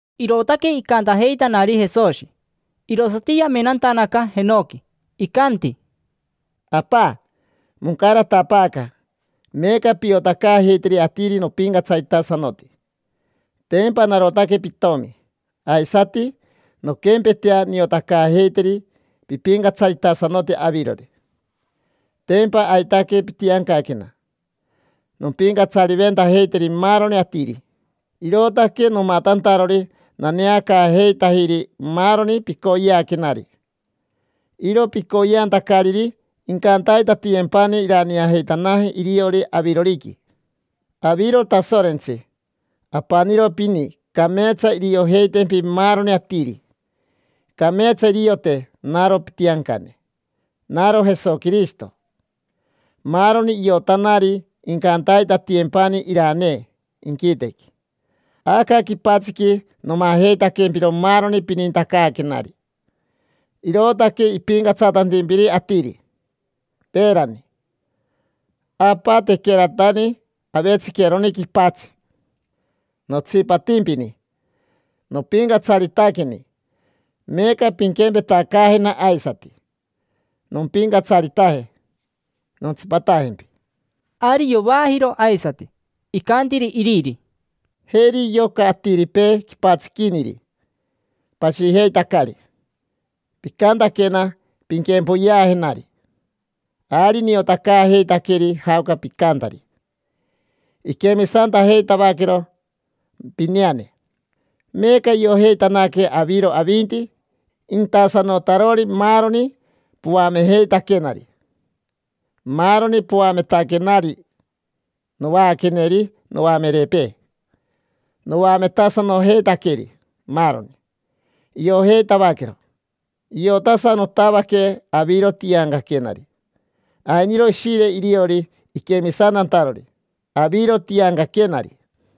Irootaque icantajeitanari Jesoshi, irosati yamenantanaca jenoqui. Icanti: —Apa, moncaratapaaca. Meeca piotacaajeiteri atiri nopincatsaritasanoti: tempa narotaque pitomi. Aisati nonquempetea, niotacaajeiteri pipincatsaritasanoti avirori. Tempa aitaque pitiancaquena nompincatsariventajeiteri maaroni atiri, irootaque nomatantarori naneacaajeitajiri maaroni picoyeaquenari. Iro picoyeantacariri incantaitatiyempani iraneajeitanaje iriori aviroriqui. Aviro Tasorentsi, apaniro pini. Cameetsa iriojeitempi maaroni atiri. Cameetsa iriote naro pitiancane, naro Jesoquirishito. Maaroni iotanari incantaitatiyempani iranee inquitequi. Aca quipatsiqui nomajeitaquempiro maaroni pinintacaaquenari, irootaque ipincatsatantimpiri atiri. Peerani, Apa, tequeratani avetsiqueroni quipatsi, notsipatimpini, nopincatsaritaqueni. Meeca pinquempetacaajena aisati, nompincatsaritaje, nontsipatajempi. Ari yovaajiro aisati, icantiri Iriri: —Jeri yoca atiripee quipatsiquiniri pashijeitacari. Picantaquena: “Pinquempoyeajenari”. Ari niotacaajeitaqueri jaoca picantari. Iquemisantajeitavaquero pineane. Meeca iojeitanaque aviro avinti intasanotarori maaroni poamejeitaquenari. Maaroni poametaquenari, novaaqueneri noamerepee, noametasanojeitaqueri maaroni. Iojeitavaquero. Iotasanotavaque aviro tiancaquenari. Ainiro ishire iriori iquemisantantarori aviro tiancaquenari.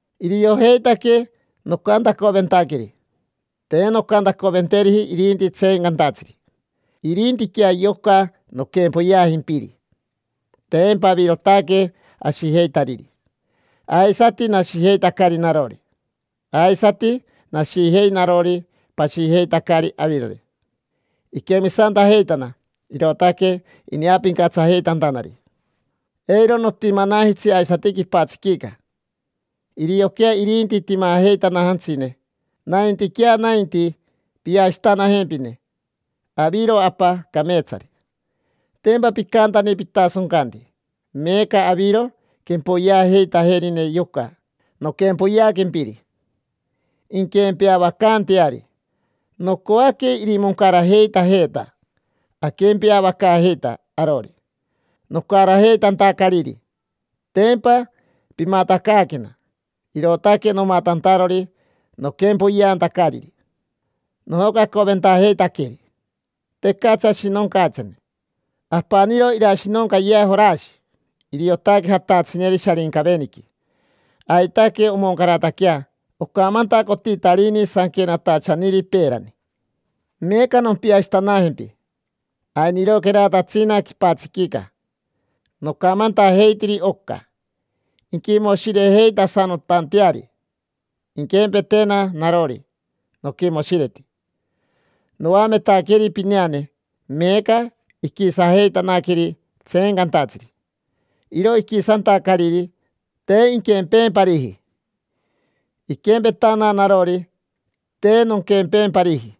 Iriojeitaque nocantacoventaqueri. Te noncantacoventeriji irinti tseencantatsiri, irintiquea yoca noquempoyeajimpiri. Tempa avirotaque ashijeitariri, aisati nashijeitacari narori. Aisati nashijei narori, pashijeitacari avirori. Iquemisantajeitana, irootaque ineapincatsajeitantanari. Eiro notimanajitsi aisati quipatsiquica, irioquea irinti timajeitanajantsine, naintiquea nainti piashitanajempine. Aviro, Apa, cameetsari. Tempa picantani pitasoncanti. Meeca aviro quempoyeajeitajerine yoca noquempoyeaquempiri, inquempeavacaanteari. Nocoaque irimoncarajeitajeeta aquempeavacaajeita arori. Nocarajeitantacariri, tempa pimatacaaquena, irootaque nomatantarori noquempoyeantacariri. Nojocacoventajeitaqueri: tecatsi ashinoncachane, apaniro irashinoncayea Jorashi, iriotaque jatatsineri Sharincaveniqui. Aitaque omoncarataquea ocamantacotitarini sanquenatachaniri peerani. Meeca nompiashitanajempi. Ainiroqueratatsina quipatsiquica, nocamantajeitiri oca, inquimoshirejeitasanotanteari, inquempetena narori noquimoshireti. Noametaqueri pineane, meeca iquisajeitanaqueri tseencantatsiri. Iro iquisantacariri, te inquempeempariji. Iquempetana narori, te nonquempeempariji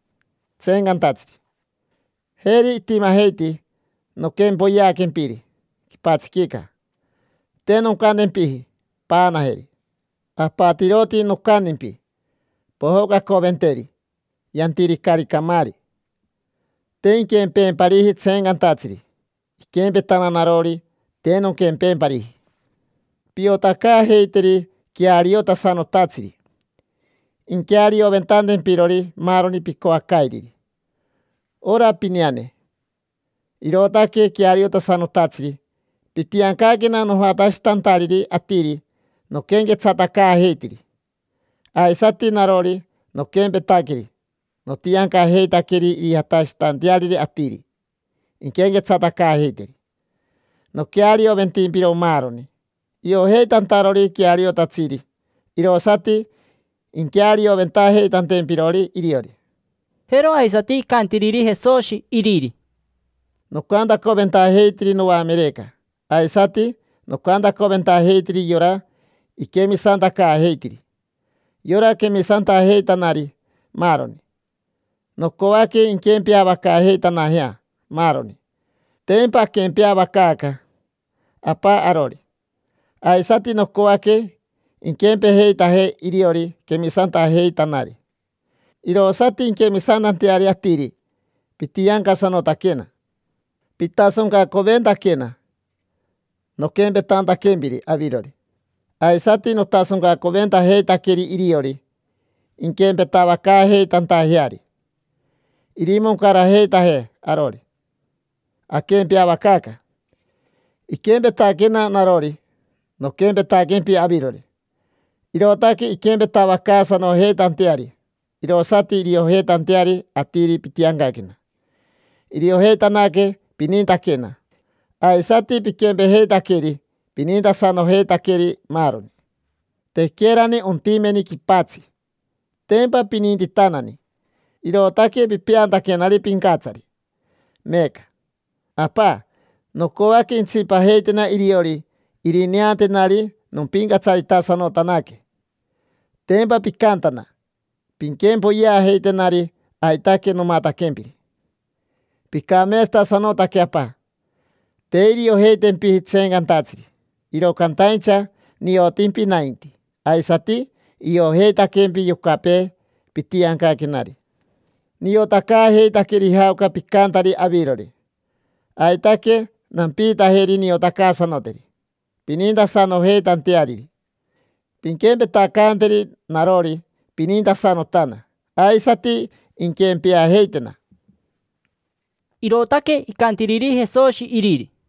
tseencantatsiri. Jeri itimajeiti noquempoyeaquempiri quipatsiquica. Te noncantempiji: “Paanajeri”. Apatiroti nocantimpi: “Pojocacoventeri. Yantiricari camaari”. Te inquempeempariji tseencantatsiri. Iquempetana narori, te nonquempeempariji. Piotacaajeiteri queariotasanotatsiri, inquearioventantempirori maaroni picoacairiri. Ora pineane, irootaque queariotasanotatsiri. Pitiancaquena nojatashitantariri atiri noquenquetsatacaajeitiri. Aisati narori noquempetaqueri, notiancajeitaqueri irijatashitanteariri atiri inquenquetsatacaajeiteri. Noquearioventimpiro maaroni, iojeitantarori queariotatsiri, irosati inquearioventajeitantempirori iriori. Jero aisati icantiriri Jesoshi iriri: —Nocantacoventajeitiri noamereca. Aisati noncantacoventajeiteri yora iquemisantacaajeitiri: yora quemisantajeitanari, maaroni. Nocoaque inquempeavacaajeitanajea maaroni. Tempa aquempeavacaaca, Apa, arori. Aisati nocoaque inquempejeitajee iriori quemisantajeitanari, irosati inquemisantanteari atiri pitiancasanotaquena. Pitasoncacoventaquena noquempetantaquempiri avirori, aisati notasoncacoventajeitaqueri iriori, inquempetavacaajeitantajeari. Irimoncarajeitajee arori, aquempeavacaaca. Iquempetaquena narori. Noquempetaquempi avirori. Irootaque inquempetavacaasanojeitanteari, irosati iriojeitanteari atiri pitiancaquena. Iriojeitanaque pinintaquena, aisati piquempejeitaqueri, pinintasanojeitaqueri maaroni. Tequerani ontimeni quipatsi, tempa pinintitanani, irootaque pipeantaquenari pincatsari. Meeca, Apa, nocoaque intsipajeitena iriori irineantenari nompincatsaritasanotanaque. Tempa picantana: “Pinquempoyeajeitenari”, aitaque nomataquempiri. Picameetsatasanotaque, Apa. Te iriojeitempiji tseencantatsiri, iro cantaincha niotimpi nainti. Aisati iojeitaquempi yocapee pitiancaquenari, niotacaajeitaqueri jaoca picantari avirori. Aitaque nampiitajeri niotacaasanoteri, pinintasanojeitanteariri, pinquempetacanteri narori pinintasanotana. Aisati inquempeajeitena. Irootaque icantiriri Jesoshi Iriri.